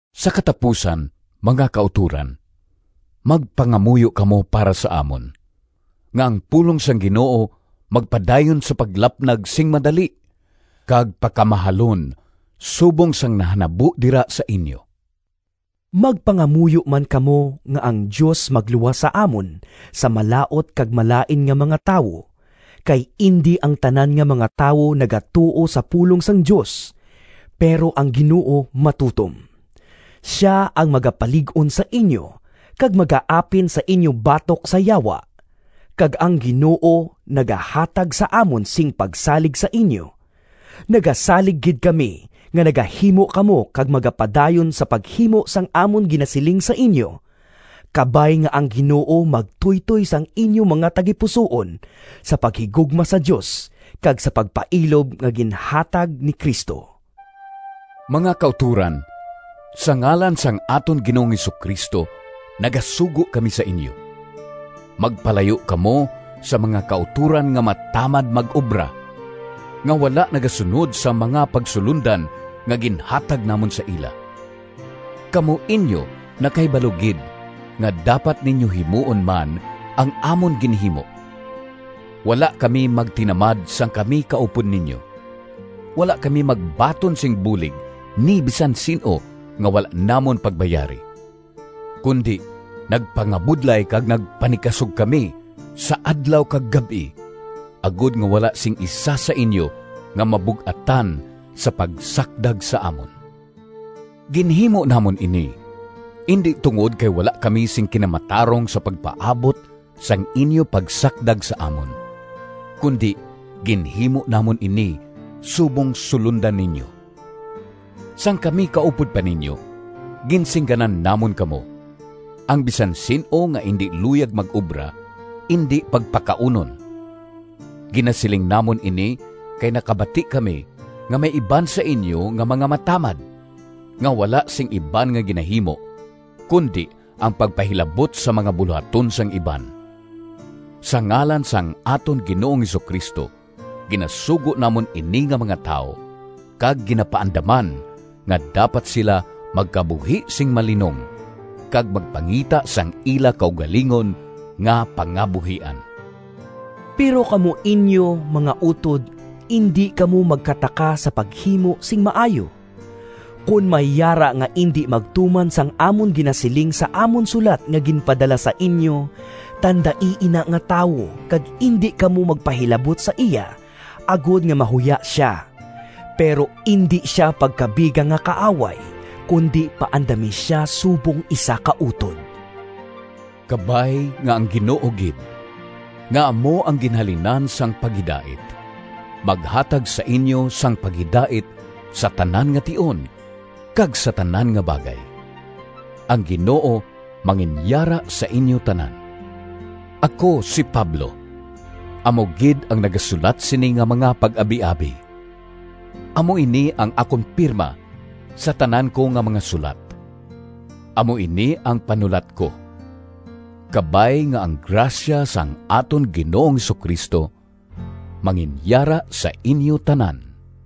Sa katapusan, mga kautoran, magpangamuyo kamo para sa amon, nga ang pulong sang Ginoo magpadayon sa paglapnag sing madali kag pakamahalon subong sang nahanabo dira sa inyo. Magpangamuyo man kamo nga ang Dios magluwas sa amon sa malaut kag malain nga mga tawo. Kay indi ang tanan nga mga tawo nagatuo sa pulong sang Dios. Pero ang Ginoo matutom. Sia ang magapalig-on sa inyo kag magaapin sa inyo batok sa Yawa. Kag ang Ginoo nagahatag sa amon sing pagsalig sa inyo. Nagasalig gid kami nga nagahimo kamo kag magapadayon sa paghimo sang amon ginasiling sa inyo. Kabay nga ang Ginoo magtuytoy sang inyo mga tagipusoon sa paghigugma sa Dios kag sa pagpailob nga ginhatag ni Cristo. Mga kautoran, sa ngalan sang aton Ginoong Jesu-Cristo nagasugo kami sa inyo: magpalayo kamo sa mga kautoran nga matamad mag-obra, nga wala nagasunod sa mga pagsulondan nga ginhatag namon sa ila. Kamo inyo nakahibalo gid nga dapat ninyo himuon man ang amon ginhimo. Wala kami magtinamad sang kami kaupod ninyo. Wala kami magbaton sing bulig ni bisan sin-o nga wala namon pagbayari, kundi nagpangabudlay kag nagpanikasog kami sa adlaw kag gab-i, agod nga wala sing isa sa inyo nga mabug-atan sa pagsakdag sa amon. Ginhimo namon ini indi tungod kay wala kami sing kinamatarong sa pagpaabot sang inyo pagsakdag sa amon, kundi ginhimo namon ini subong sulondan ninyo. Sang kami kaupod pa ninyo, ginsingganan namon kamo, “Ang bisan sin-o nga indi luyag mag-obra indi pagpakaunon.” Ginasiling namon ini kay nakabati kami nga may iban sa inyo nga mga matamad, nga wala sing iban nga ginahimo kundi ang pagpahilabot sa mga bulohaton sang iban. Sa ngalan sang aton Ginoong Jesu-Cristo ginasugo namon ini nga mga tawo kag ginapaandaman nga dapat sila magkabuhi sing malinong, kag magpangita sang ila kaugalingon nga pangabuhian. Pero kamo inyo, mga utod, indi kamo magkataka sa paghimo sing maayo. Kon may yara nga indi magtuman sang amon ginasiling sa amon sulat nga ginpadala sa inyo, tandai ina nga tawo kag indi kamo magpahilabot sa iya, agod nga mahuya sia. Pero indi sia pagkabiga nga kaaway, kundi paandami sia subong isa ka utod. Kabay nga ang Ginoo gid, nga amo ang ginhalinan sang paghidait, maghatag sa inyo sang paghidait sa tanan nga tion kag sa tanan nga bagay. Ang Ginoo manginyara sa inyo tanan. Ako, si Pablo, amo gid ang nagasulat sini nga mga pag-abiabi. Amo ini ang akon pirma sa tanan ko nga mga sulat. Amo ini ang panulat ko. Kabay nga ang grasya sang aton Ginoong Jesu-Cristo manginyara sa inyo tanan.